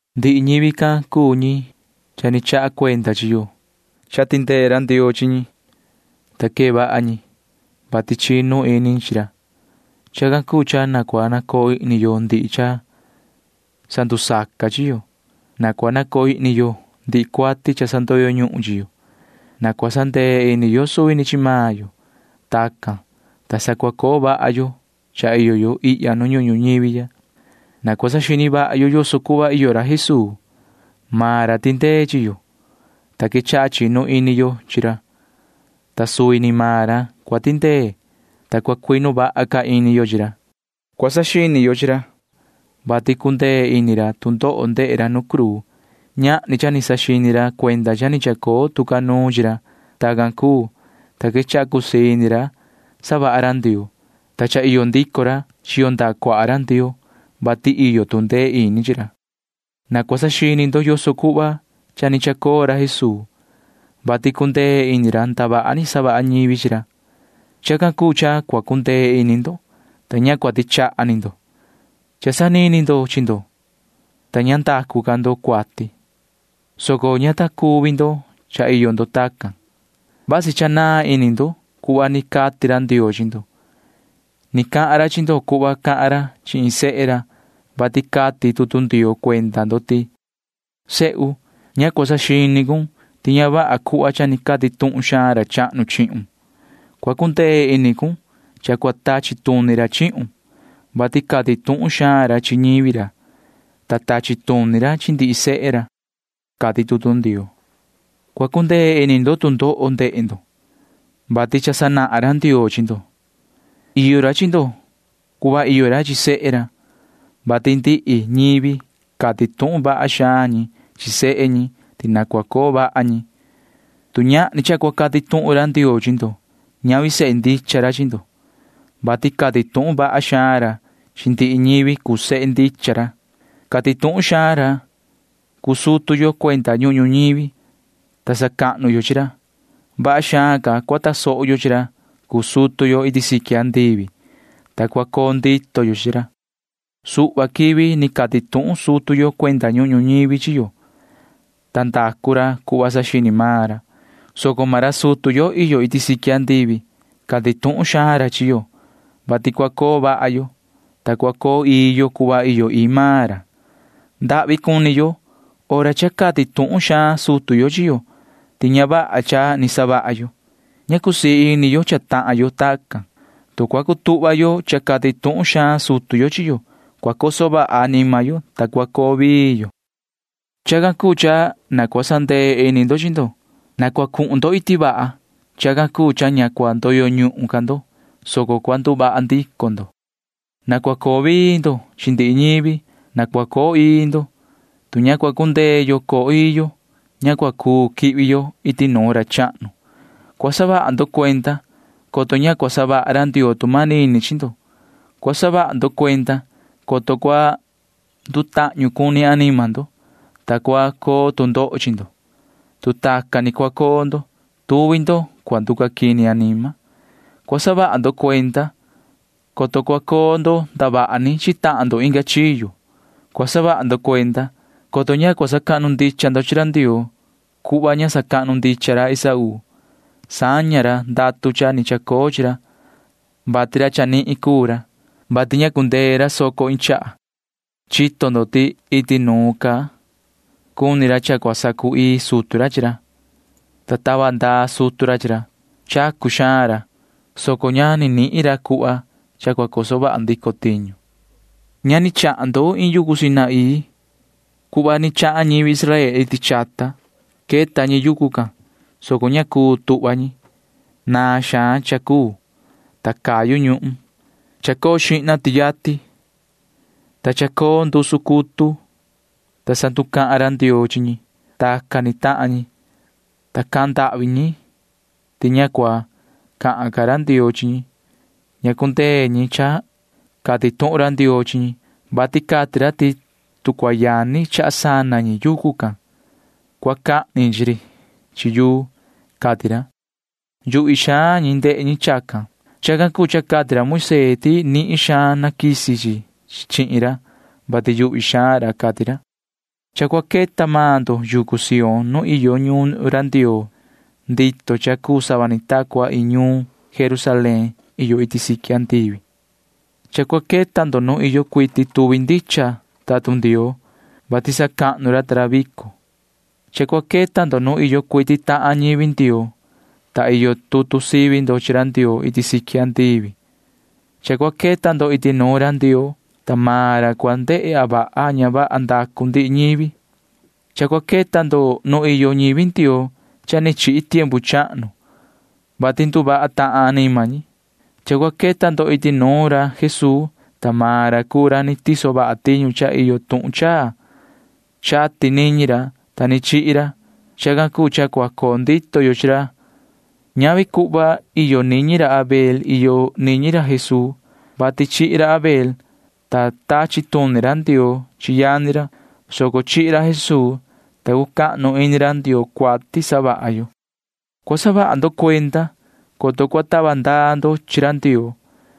Ndihi ñivi can cuu ñi cha ni chaha cuenda chi yo. Cha tindee ra Ndioo chi ñi, ta quee vaha ñi, vati chinu ini ñi chi ra. Chacan cuu cha na cua nacoo ihni yo ndihi cha sandusaca chi yo. Na cua nacoo ihni yo ndihi cuati cha sandoyo ñuhun chi yo. Na cua sandee ini yo suvi ni chi maan yo. Tacan, ta sa cua coo vaha yo cha iyo yo ihya nu ñuhun ñuñivi ya. Na cua saxini vaha yo yoso cuhva iyo ra Jesuu. Maan ra tindee chi yo, ta quechaha chinu ini yo chi ra, ta suvi ni maan ra cua tindee, ta cua cuinu vaha ca ini yo chi ra. Cua saxini yo chi ra, vati cundee ini ra tu ndoho ndehe ra nu cruu. Ñahni cha ni saxini ra cuenda cha ni chacoo tu ca nuun chi ra. Tacan cuu, ta quechaha cusii ini ra savaha ra Ndioo, ta cha iyo ndico ra chiyo ndaha cuaha ra Ndioo, [vati iyo tu ndee ini chi ra]. Na cua saxini ndo yoso cuhva cha ni chacoo ra Jesuu, vati cundee ini ra ndavaha ni savaha ñivi chi ra. Chacan cuu cha cua cundee ini ndo, ta ña cua tichaha ni ndo. Cha sanini ndo chi ndo, ta ña ndacu ca ndo cuati, soco ña ta cuvi ndo cha iyo ndo tacan. Vasi cha naan ini ndo cuhva ni cati ra Ndioo chi ndo. Ni cahan ra chi ndo cuhva cahan ra chi iin sehe ra, vati cati tutu Ndioo cuenda ndo ti: Sehu, ña cua saxini cun ti ña vaha cuhva cha cati tuhun xaan ra chahnu chihun. Cua cundee ini cun cha cua tachi tuni ra chihun, vati cati tuhun xaan ra chi ñivi ra, ta tachi tuni ra chi ndihi sehe ra, cati tutu Ndioo. Cua cundee ini ndo tu ndoho ndehe ndo, vati cha sanahan ra Ndioo chi ndo. Iyo ra chi ndo cuhva iyo ra chi sehe ra, vati ndihi ñivi cati tuhun vaha xaan ñi chi sehe ñi ti na cua coo vaha ñi. Tu ñahni cha cua cati tuhun ra Ndioo chi ndo, ñavi sehe ndicha ra chi ndo, vati cati tuhun vaha xaan ra chi ndihi ñivi cuu sehe ndicha ra. Cati tuhun xaan ra cuu sutu yo cuenda ñuhun ñuñivi, ta sacahnu yo chi ra. Vaha xaan ca cua tasoho yo chi ra cuu sutu yo iti siqui andivi, ta cua coo ndito yo chi ra. Suhva quivi ni cati tuhun sutu yo cuenda ñuhun ñuñivi chi yo, ta ndacu ra cuhva saxini maan ra, soco maan ra sutu yo iyo iti siqui―cati tuhun xaan ra chi yo, vati cua coo vaha yo, ta cua coo ii yo cuhva iyo ii maan ra. Ndahvi cuni yo hora cha cati tuhun xaan sutu yo chi yo ti ña vaha cha ni savaha yo. Ña cusii ini yo cha tahan yo tacan. Tu cua cutuhva yo cha cati tuhun xaan sutu yo chi yo, cua coso vaha anima yo, ta cua coo vii yo. Chacan cuu cha na cua sandee ini ndo chi ndo. Na cua cuhun ndo iti vaha. Chacan cuu cha ña cua ndoyo ñuhun ca ndo, soco cua nduvaha ndico ndo. Na cua coo vii ndo chi ndihi ñivi. Na cua coo ii ndo. Tu ña cua cundee yo coo ii yo, ña cua cuu quihvi yo iti nuun ra chahnu. Cua saha ndo cuenda, coto ña cua savaha ra Ndioo tu manini chi ndo. Cua saha ndo cuenda, coto cua ndutahñu cuni anima ndo, ta cua coo tu ndoho chi ndo. Tu tacan ni cua coo ndo, tuvi ndo cua nducaquini anima. Cua saha ndo cuenda, coto cua coo ndo ndavaha ni chi tahan ndo inga chiyo. Cua saha ndo cuenda, coto ña cua sacahnu ndicha ndo chi ra Ndioo cuhva ña sacahnu ndicha ra Esaú. Saña ra ndatu cha ni chacoo chi ra, vati ra chanihin cuu ra, vati ña cundee ra soco iin chaha. Chito ndo ti iti nuun ca cuni ra cha cua sacu‑ii sutu ra chi ra, ta tava ndaa sutu ra chi ra. Chacu xaan ra, soco ña ni nihin ra cuhva cha cua coso vaha ndico tiñu. Ña ni chahan ndo iin yucu Sinaí cuhva ni chahan ñivi Israel iti chata. Queta ñi yucu can, soco ña cuu tuhva ñi. Naan xaan cha cuu, ta cayu ñuhun. Chacoo xihna tiati, ta chacoo ndusu cutu, ta sa nducahan ra Ndioo chi ñi. Tacan ni tahan ñi, ta cahan ndahvi ñi ti ña cua cahan ca ra Ndioo chi ñi. Ña cundee ñi cha cati tuhun ra Ndioo chi ñi, vati cati ra ti tu cua yani chaha sana ñi yucu can, cua cahni ñi chi ri chi yuu, cati ra. Yuhvi xaan ñi ndehe ñi chacan. Chacan cuu cha cati ra Moisee ti nihin xaan naquisi chi chihin ra, vati yuhvi xaan ra, cati ra. Cha cua queta maan ndo yucu Sión nu iyo ñuun ra Ndioo ndito cha cuu sava ni ta cua iin ñuun Jerusalén iyo iti siqui andivi. Cha cua queta ndo nu iyo cuiti tuvi ndicha tatun Ndioo, vati sacahnu ra ta ra vico. Cha cua queta ndo nu iyo cuiti tahan ñivi Ndioo, ta iyo tutu sivi ndo chi ra Ndioo iti siqui andivi. Cha cua queta ndo iti nuun ra Ndioo, ta maan ra cua ndehe a vaha a ña vaha ndacu ndihi ñivi. Cha cua queta ndo nu iyo ñivi Ndioo cha ni chihi tiempu chahnu, vati nduvaha tahan anima ñi. Cha cua queta ndo iti nuun ra Jesuu, ta maan ra cuu ra ni tiso vaha tiñu cha iyo tuhun chaa. Chati niñi ra, ta ni chihi ra. Chacan cuu cha cua coo ndito yo chi ra. Ñavi cuhva iyo niñi ra Abel iyo niñi ra Jesuu, [vati chihi ra Abel, ta tachi tuni ra Ndioo chi yani ra, soco chihi ra Jesuu, ta cucahnu ini ra Ndioo cuati savaha yo]. Cua saha ndo cuenda, coto cua tava ndaa ndo chi ra Ndioo,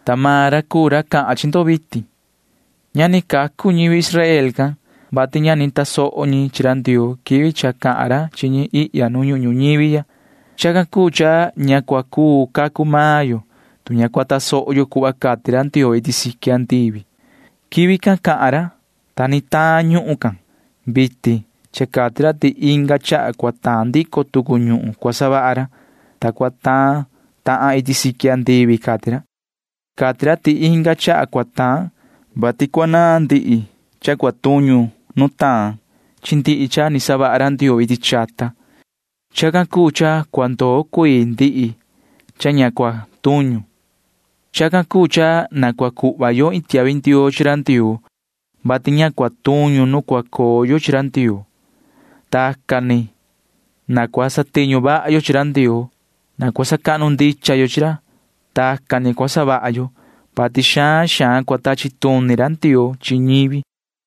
ta maan ra cuu ra cahan chi ndo vitin. Ña ni cacu ñivi Israel can, vati ña ni tasoho ñi chi ra Ndioo quivi cha cahan ra chi ñi ihya nu ñuhun ñuñivi ya. Chacan cuu cha ña cua cuu cacu maan yo, tu ña cua tasoho yo cuhva cati ra Ndioo iti siqui andivi. Quivi can cahan ra, ta ni taan ñuhun can. Vitin cha cati ra ti inga chaha cua taan ndico tucu ñuhun cua savaha ra, ta cua taan tahan iti siqui andivi, cati ra. Cati ra ti inga chaha cua taan, vati cua naan ndihi cha cua tuñu nu taan chi ndihi cha ni savaha ra Ndioo iti chata. Chacan cuu cha cua ndoo cuii ndihi cha ña cua tuñu. Chacan cuu cha na cua cuhva yo iin tiahvi ndioo chi ra Ndioo, vati ña cua tuñu nu cua coo yo chi ra Ndioo. Tacan ni na cua satiñu vaha yo chi ra Ndioo. Na cua sacahnu ndicha yo chi ra. Tacan ni cua savaha yo, vati xaan xaan cua tachi tuni ra Ndioo chi ñivi.